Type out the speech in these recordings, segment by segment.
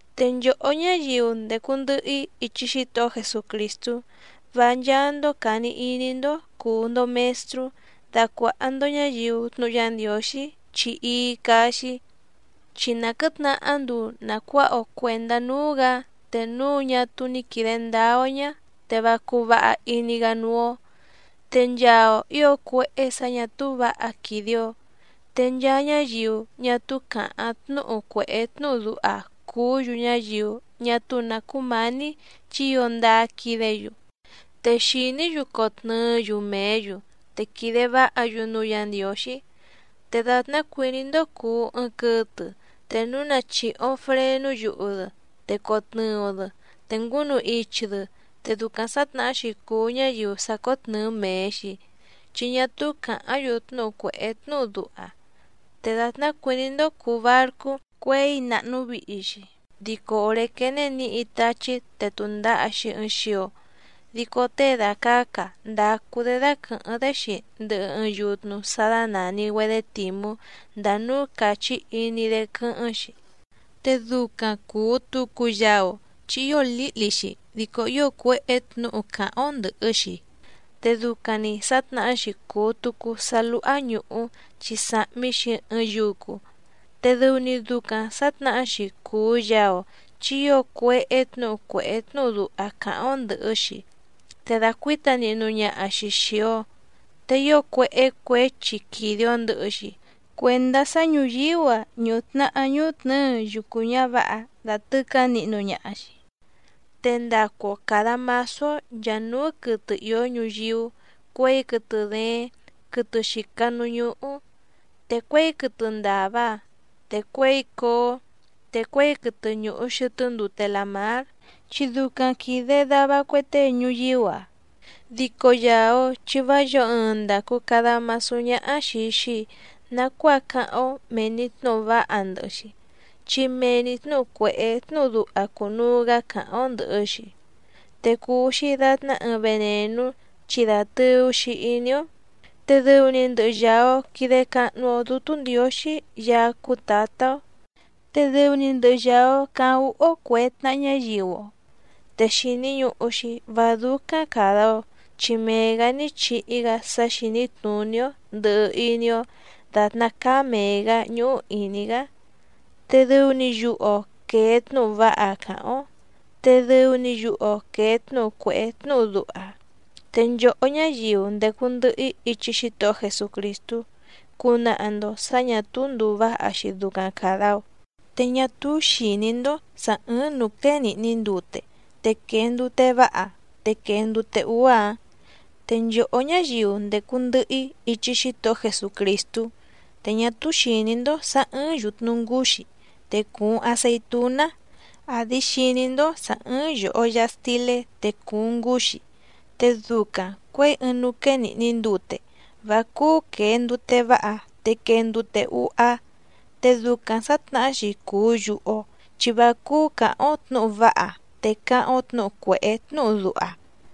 Te nchòhó ñáyiu ndècu ndɨhɨ‑í ichi Xítohó Jesucrìstú, vá ncháá‑ndó càni iní‑ndó cùu‑ndo mestrú dacuàha‑ndo ñáyiu tnúhu Yá Ndiǒxí chi íí cáá‑xí. Chi na quɨ̌tnahá nduu nàcuáha‑o cuèndá núú‑gǎ, te núu ñá túú ní quìde ndáá‑ó ñá, te vá cúú vǎha iní‑gá núú‑ó. Te nchaa‑o ǐo cuéhé sǎ ñà túú vǎha quìde‑o. Te nchaa ñáyiu ñá túú càháⁿ tnúhu cuèhé tnúhu duha cùú‑yu ñáyiu ñá túú nǎ cúmǎní chi ío ndáá quídě‑yu. Te xìní‑yu cotnɨɨ́‑yu mèé‑yu, te quìde váha‑yu núú Yǎ Ndiǒxí. Te dàtná cuìní‑ndó cùu ɨɨⁿ quɨtɨ te núu na chìhi‑o frenú yuhu‑dɨ, te cotnɨɨ‑o‑dɨ te ngúnu ichi‑dɨ, te ducaⁿ sǎtnahá‑xi cùu ñáyiu sàcótnɨɨ mee‑xi, chi ñá túú càháⁿ‑yu tnúhu cuèhé tnúhu duha. Te dàtná cuìní‑ndó cùu barcú cuěi nàhnu vihi‑xi, dico òré quéné nǐhi táchí te tùndaha‑xi ɨɨⁿ xio, dico tée dàcaca ndacu‑dé dáquɨ̀hɨ́ⁿ‑dé‑xi ndɨhɨ ɨɨⁿ yutnu sá dánàni‑güedé tìmú ndàa núú càchí iní‑dé quɨ́hɨ́ⁿ‑xi. Te ducaⁿ cùu tucu yaa‑o chi ío lǐhli‑xi dico ío cuéhé tnǔhu càháⁿ‑ó ndɨ̀hɨ‑xi. Te ducaⁿ‑ni sǎtnahá‑xi cùu tucu sá lúhá ñùhú chi sàhmi‑xi ɨɨⁿ yucu. Te dɨu‑ni ducaⁿ sǎtnahá‑xi cùu yaa‑o chi ío cuéhé tnǔhu cuèhé tnúhu duha càháⁿ‑ó ndɨ̀hɨ‑xi, te dàcuíta nihnu ñaha‑xi xìi‑o. Te ío cuéhé cuěchi quìde‑o ndɨhɨ‑xi cuendá sá ñùyíú‑a ñùhu tnahá ñúhú tnɨ̌ɨ yucu ñǎvǎha dàtɨcá nihnu ñaha‑xi. Te ndacu‑o càda masú‑ó nchàa núú quɨtɨ ìó ñuyíú cuěi quɨtɨ dééⁿ quɨtɨ xìca núú ñúhú, te cuěi quɨtɨ ndàva, te cuěi cóó, te cuěi quɨtɨ ñùhu xɨtɨ́ ndute làmár, chi ducaⁿ quìde dava cue tée ñuyíú‑a. Dico yàa‑o chi vá yǒo ɨɨⁿ ndàcu cada masú ñáhá xìi‑xi nacuáa cáháⁿ‑ó mèe‑ni tnúhu váha ndɨhɨ‑xi, chi mee‑ni tnǔhu cuèhé tnúhu duha cùnuu‑gá càháⁿ‑ó ndɨ̀hɨ‑xi. Te cùu‑xi datná ɨɨⁿ venènú chi dàtɨu‑xi iní‑ó. Te dɨu‑ni ndɨhɨ yàa‑o quide cahnu‑o Dútú Ndiǒxí Yaá cúú Tǎtá‑ó, te dɨu‑ni ndɨhɨ yàa‑o caháⁿ úhú‑ó cuè tnaha ñáyiu‑o. Te xìni ñuhu‑xi vá dúcáⁿ càda‑o, chi mee‑gǎ ní chihi‑gá sá xìní tnùní‑ó ndɨ̀hɨ iní‑ó, dàtná cáá mèe‑gá ñúhú ìní‑gá. Te dɨu‑ni yuhu‑o quèe tnúhu váha càháⁿ‑ó, te dɨu‑ni yuhu‑o quèe tnúhu cuèhé tnúhu duha. Te nchòhó ñáyiu ndècu ndɨhɨ‑í ichi Xítohó Jesucrìstú cunaha‑ndo sǎ ñà túú ndùu váha‑xi ducaⁿ càda‑o. Te ñá túú xìní‑ndó sǎ ɨ̀ɨⁿ núú quéé nìhni ndute, te quèe ndute váha te quèe ndute úá‑ǎⁿ. Te nchòhó ñáyiu ndècu ndɨhɨ‑í ichi Xítohó Jesucrìstú, te ñá túú xìní‑ndó sǎ ɨ̀ɨⁿ yutnu ngúxí, te cùuⁿ aceitúná, àdi xiní‑ndó sǎ ɨ̀ɨⁿ yoho yaha stilé te cùuⁿ ngúxí. Te ducaⁿ cuěi ɨɨⁿ núú quéé nìhni ndute, vá cúú quèe ndute váha te quee ndute úhá. Te ducaⁿ sǎtnahá‑xi cùu yuhu‑o chi vá cúú càháⁿ‑ó tnǔhu váha te cáháⁿ‑ó tnǔhu cuèhé tnúhu duha.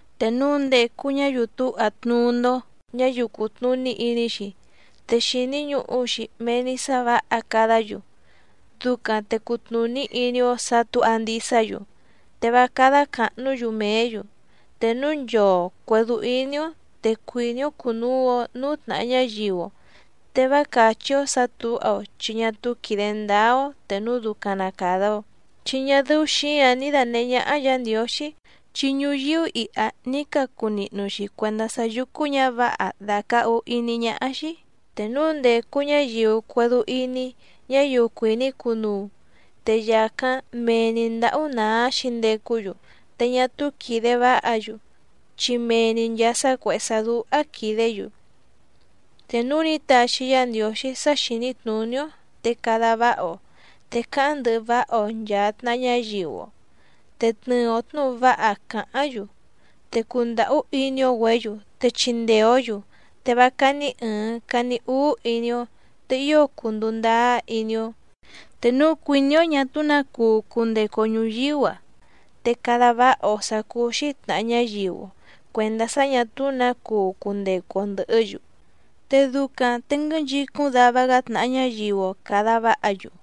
Te núu ndècu ñáyiu túha tnuú‑ndó ñáyiu cùtnuní iní‑xi, te xìni ñuhu‑xi mee‑ni sá vǎha cadá‑yu, ducaⁿ te cutnùní iní‑ó sǎ tǔha ndisá‑yu, te vá cádá càhnú‑yu mèé‑yu. Te núu nchoo cuèdú íní‑ó te cuìní‑ó cùnuu‑o núú tnàha ñáyiu‑o, te vá càchí‑ó sǎ tǔha‑o, chi ñá túú quìde ndáá‑ó te núu ducaⁿ na càda‑o. Chi ñá dɨ́ú xǐǎⁿ ní dànehé ñáhá Yǎ Ndiǒxí, chi ñuyíú iha ní cacu nihnu‑xi cuèndá sá yùcu ñávǎha dàcahu iní ñáhá‑xí. Te núú ndécú ñǎyiu cuédú íní ñáyiu cuìní cunuu, te yàcáⁿ mee‑ni ndǎhú nàá xǐndecú‑yu, te ñá túú quìde váha‑yu, chi mee‑ni nchàa sá cuèhé sá dúhá quìdé‑yu. Te núu ní taxi Yá Ndiǒxí sá xìní tnùní‑ó, te cada váha‑o, te cáháⁿ ndɨhɨ váha‑o nchàa tnaha ñáyiu‑o, te tnɨɨ‑o tnǔhu váha càháⁿ‑yu, te cundàhú iní‑ó‑güě‑yu te chindee‑ǒ‑yu, te vá cání ɨ̀ɨⁿ cani úú iní‑ó, te ío cunduu ndáá iní‑ó. Te núu cuìní‑ó ñà túú nǎ cuu cundecu‑o ñùyíú‑a, te cada váha‑o sǎ cúú‑xí tnàha ñáyiu‑o cuèndá sá ñà túú nǎ cuu cundecu‑o ndɨ̀hɨ́‑yu. Te ducaⁿ te nguɨ́nchicúⁿ dava‑gá tnàha ñáyiu‑o càda váha‑yu.